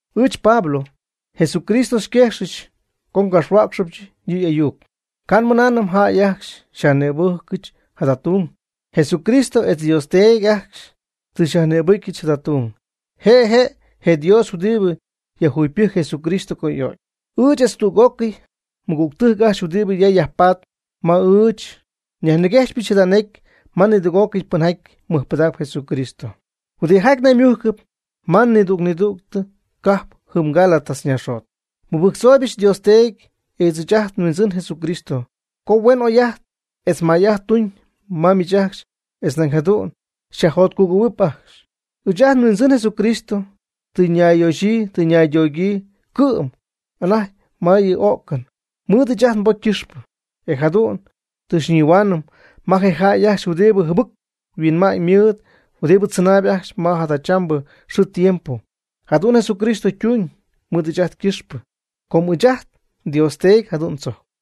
Ɨɨch Pablo, Jesucristo xyquejxɨch co ngapxhuäcxɨbyɨch yɨ' y'ayuc. Ca' nmɨnaanɨm jäy ajcxy xyajnïbɨjcɨch jada tung. Jesucristo etz Dios Teedy ajcxy tɨ xyajnïbɨcyɨch jada tung. Je' je' je Dios huɨdibɨ yajjugypɨjc Jesucristo co y'o'cy. Ɨɨch etz tüg'ócɨy mɨgügtɨjc ajcxy huɨdibɨ ya yajpatp ma ɨɨch nyajniguejxpɨch jada necy ma nidüg'ócɨy pɨnjaty mɨjpɨdacp Jesucristo, huɨdijaty naymujcɨp ma nidüg nidüg cajp jɨm Gálatas naaxjot. Nmɨbɨjctzooybɨch Dios Teedy etz ɨɨch ajt nHuindzɨn Jesucristo co huen oy'ajt etz may'ajt tuñ ma miich ajcxy etz nañ jadu'n xyajjotcugɨ̈huɨp ajcxy. Ɨɨch ajt nHuindzɨn Jesucristo tɨ nayyoxyii tɨ naydogyii cɨ'm anajty ma yɨ o'cɨn mɨɨd ɨɨch ajt nbocy ycɨxpɨ. E jadu'n tɨ xyñihuaanɨm ma je jäy ajcxy huɨdibɨ jɨbɨc huinma'ñ ymɨɨd huɨdibɨ tzɨnaayb ajcxy ma jadachambɨ xɨɨ tiempo. Jadu'n Jesucristo tuñ mɨɨd ɨɨch ajt ycɨxpɨ, com ɨɨch ajt nDios Teedy jadu'n tzojcp.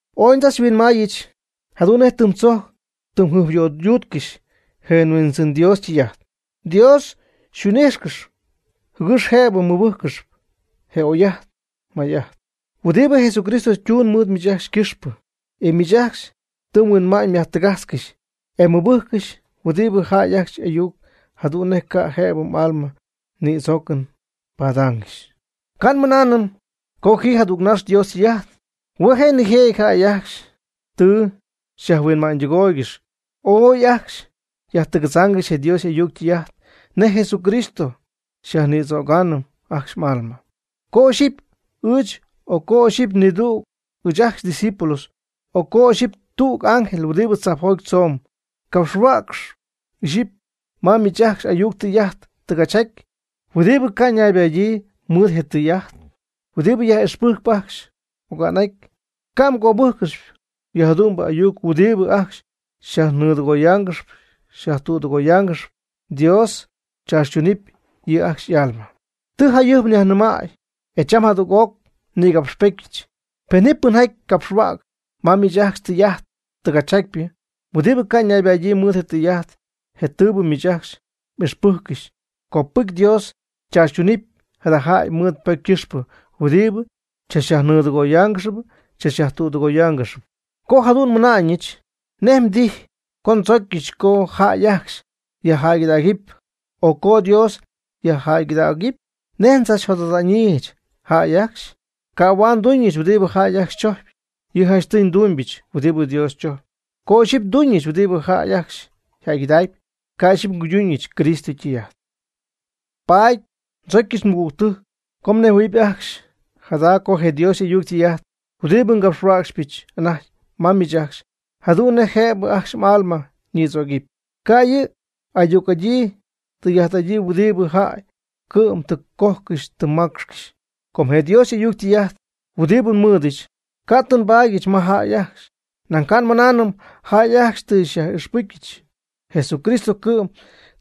Ooy ndzachhuinmaayɨch jadu'n nej tɨm tzojcy tɨ mjɨjpyöydutcɨxy je Huindzɨn Dios ytɨy'ajt. Dios xyhuin'ijxcɨxy jɨgɨx jëbɨ mmɨbɨjccɨxy je oy'ajt je may'ajt huɨdibɨ Jesucristo ytuun mɨɨd miich ajcxy ycɨxpɨ. E miich ajcxy tɨ mhuinma'ñ myajtɨgajtzcɨxy, e tɨ mmɨbɨjccɨxy huingbɨ jäy ajcxy y'ayuc, jadu'n nej ca' jëbɨ m'alma nïdzoocɨn padaangɨxy. Ca' nmɨnaanɨm co ji jadügnax Dios ytɨy'ajt. Hue' je'nijëjɨty jäy ajcxy tɨ xyajhuinma'ñydɨgooygɨxy, ooy ajcxy yajtɨgadzaangɨxy je Dios y'ayuc ytɨy'ajt nej Jesucristo xyajnïdzögaanɨ ajcxy m'alma. Co ixyipy ɨɨch, o co ixyipy nidüg ɨɨch ndiscípulo, o co ixyipy tüg ángel huɨdibɨ tzajpjoty tzomb capxhuäcx ixyipy ma miich ajcxy ayuc tɨy'ajt tɨgachjaty huɨdibɨ ca' ñaybadyii mɨɨd je tɨy'ajt huɨdibɨ nyaj'ixpɨjc ajcxy oga'n'aty, ca' mgöbɨ́jccɨxɨpy yɨjadu'mbɨ ayuc huɨdibɨ ajcxy xyajnɨɨdɨgoyaangɨxy xyajtüdɨgoyaangɨxy, Dios tzaachytunɨɨb yɨ' ajcxy y'alma. Tɨ jayɨjp nyajnɨmay, e cham jadüg'oc nïgapxpetyɨch, pen ji pɨnjaty capxhuäcxy ma miich ajcxy tɨy'ajt tɨgachyjatypɨ, huɨdibɨ ca' ñaybadyii mɨɨd je tɨy'ajt je tɨɨbɨ miich ajcxy m'ixpɨjccɨxy, copɨcy Dios chaachytunɨpy jada jäy mɨɨd ypocy ycɨxpɨ huɨdibɨ xychachyajnɨɨdɨgooygɨxp xychachyajtüdɨgooygɨxp. Co jadu'n nmɨna'ñɨch, ¿nej mdijy co ndzocyɨch co jäy ajcxy xyjäygɨdägɨpy o co Dios xyjäygɨdägɨpy? ¿Nej ndzachyajjot'adaanɨch jäy ajcxy? Ca' huaad nduuñɨch huɨdibɨ jäy ajcxy chojcpy, yɨ' janchtɨy ndumybɨch huɨdibɨ Dios chojcpy. Co ixyipy nduuñɨch huɨdibɨ jäy ajcxy yjäygɨdacpy, ca' ixyipy nguyduuñɨch Cristo ytɨy'ajt. Paady ndzocyɨch mɨgügtɨjc co mnejhuɨ̈huɨp ajcxy jada co je Dios y'ayuc ytɨy'ajt huɨdibɨ ngapxyhuäcxpɨch anajty ma miich ajcxy jadu'n nej jëbɨ ajcxy m'alma ñïdzögɨpy, ca' yɨ' ayuc'adyii tɨy'ajt'adyii huɨdibɨ jäy cɨ'm tɨ cojcɨxy tɨ maacxcɨxy. Com je Dios y'ayuc ytɨy'ajt huɨdibɨ nmɨɨdɨch, ca' tɨ nbaadyɨch ma jäy ajcxy, nañ ca' nmɨnaanɨm jäy ajcxy tɨ xyaj'ixpɨcyɨch. Jesucristo cɨ'm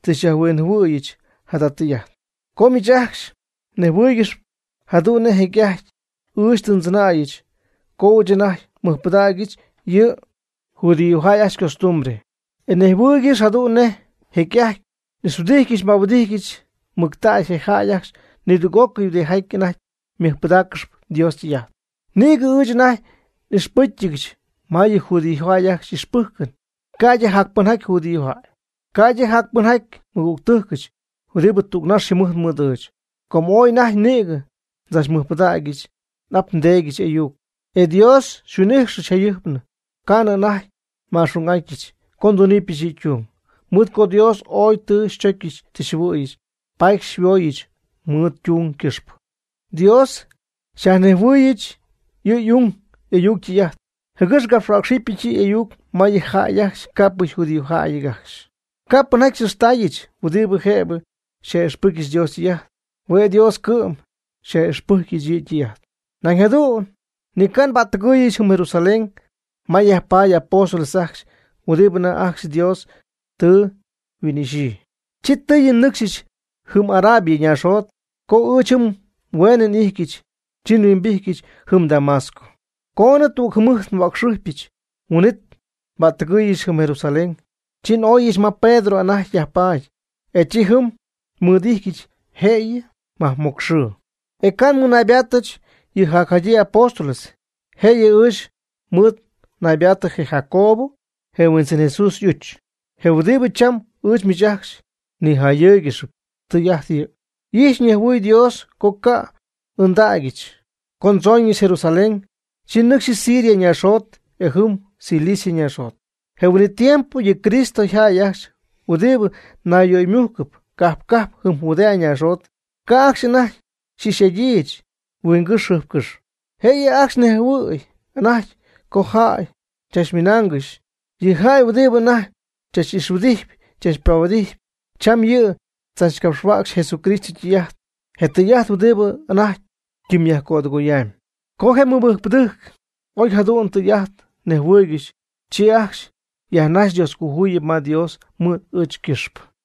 tɨ xyajhuinjɨhuɨ̈yɨch jada tɨy'ajt. Com miich ajcxy mnejhuɨɨygɨxp jadu'n nej jecy'ajty ɨɨch tɨ ndzɨnäyɨch, co ɨɨch anajty nmɨjpɨdägyɨch yɨ judíojäy ajcxy ycostumbre. E mnejhuɨɨygɨxp jadu'n nej jecy'ajty n'ixhuɨdijtyɨch nbahuɨdijtyɨch mɨctägy je jäy ajcxy nidüg'ócɨy huɨdijaty anajty mɨjpɨdaaccɨxp Dios ytɨy'ajt. Nïgɨ ɨɨch anajty n'ixpɨ́cyɨdyɨch ma yɨ judíojäy ajcxy y'ixpɨjcɨn ca'ydɨ jac pɨnjaty judíojäy, ca'ydɨ jac pɨnjaty nmɨgügtɨjcɨch huɨdibɨ tügnax yjɨmɨjt mɨɨd ɨɨch. Com ooy anajty nïgɨ ndzachmɨjpɨdägyɨch n'ap ndeedyɨch y'ayuc. E Dios xyhuin'ijxɨch jayɨjpnɨ ca'nɨ anajty ma'xung'atyñɨch co ndúnɨbɨch yɨ' ytung. Mɨɨd co Dios ooy tɨ xychocyɨch tɨ xyjɨhuɨ̈yɨch, paady xyhuooyɨch mɨɨd ytung ycɨxpɨ. Dios xyajnejhuɨɨyɨch yɨ y'ung y'ayuc ytɨy'ajt, jɨgɨx ngapxhuäcxɨbɨch yɨ' y'ayuc ma yɨ jäy ajcxy ca'pɨ yjudíojäyɨty ajcxy. Ca' pɨnjaty n'ixtaayɨch huɨdibɨ jëbɨ xyaj'ixpɨcyɨch Dios ytɨy'ajt, hue' Dios cɨ'm xyaj'ixpɨjcyɨch yɨ' ytɨy'ajt. Nañ jadu'n ni ca' nbättɨgɨɨyɨch jɨm Jerusalén ma yajpaady y'apóstoles ajcxy huɨdibɨ anajty ajcxy Dios tɨ yhuin'ixyii. Chi tɨɨyɨ nnɨcxyɨch jɨm Arabia ñaaxjot. Co ɨɨch jɨm hueenɨ n'ijtyɨch, chi nhuimbijtyɨch jɨm Damasco. Coonɨ tugɨɨg jɨmɨjt nhuäcxɨjpyɨch huin'itnɨ nbättɨgɨɨyɨch jɨm Jerusalén. Chi n'oyɨch ma Pedro anajty yajpaady, e chi jɨm nmɨɨd'ijtyɨch jëyɨ majmocx xɨɨ. E ca' nmɨnaybaattɨch yɨ jacjadyii apóstoles. Jëyɨ ɨɨch mɨɨd naybaatɨ je Jacobo, je Huindzɨn Jesús y'uch. Je huɨdibɨ cham ɨɨch miich ajcxy niyajjayɨɨygɨxyp, tɨy'ajt yɨ'. Y'ijxyp ñejhuɨɨyb Dios co ca' n'ɨɨndägyɨch. Co ndzooñɨch Jerusalén, chi nnɨcxyɨch Siria naaxjot etz jɨm Cilicia naaxjot. Je huin'it tiempo yɨ Cristo yjäy ajcxy huɨdibɨ nayyöymujcɨp cajp cajp jɨm Judea naaxjot, ca' ajcxy anajty xy'ix'adyiijɨch huingɨ́xy jɨjpcɨ́xy. Jëyɨ ajcxy nejhuɨ̈y anajty co jäy chachmɨnaangɨxy: “Yɨ jäy huɨdibɨ anajty xychach'ixhuɨdijtɨm xychachpahuɨdijtɨm, cham yɨ' tzachcapxhuäcxy je Cristo ytɨy'ajt, je tɨy'ajt huɨdibɨ anajty ytimyyajcödɨgoyamyb.” Co je mɨbɨjcpɨdɨjc oy jadu'n tɨy'ajt nejhuɨɨygɨxy, chi ajcxy yajnajxy Dioscojuyip ma Dios mɨɨd ɨɨch ycɨxpɨ.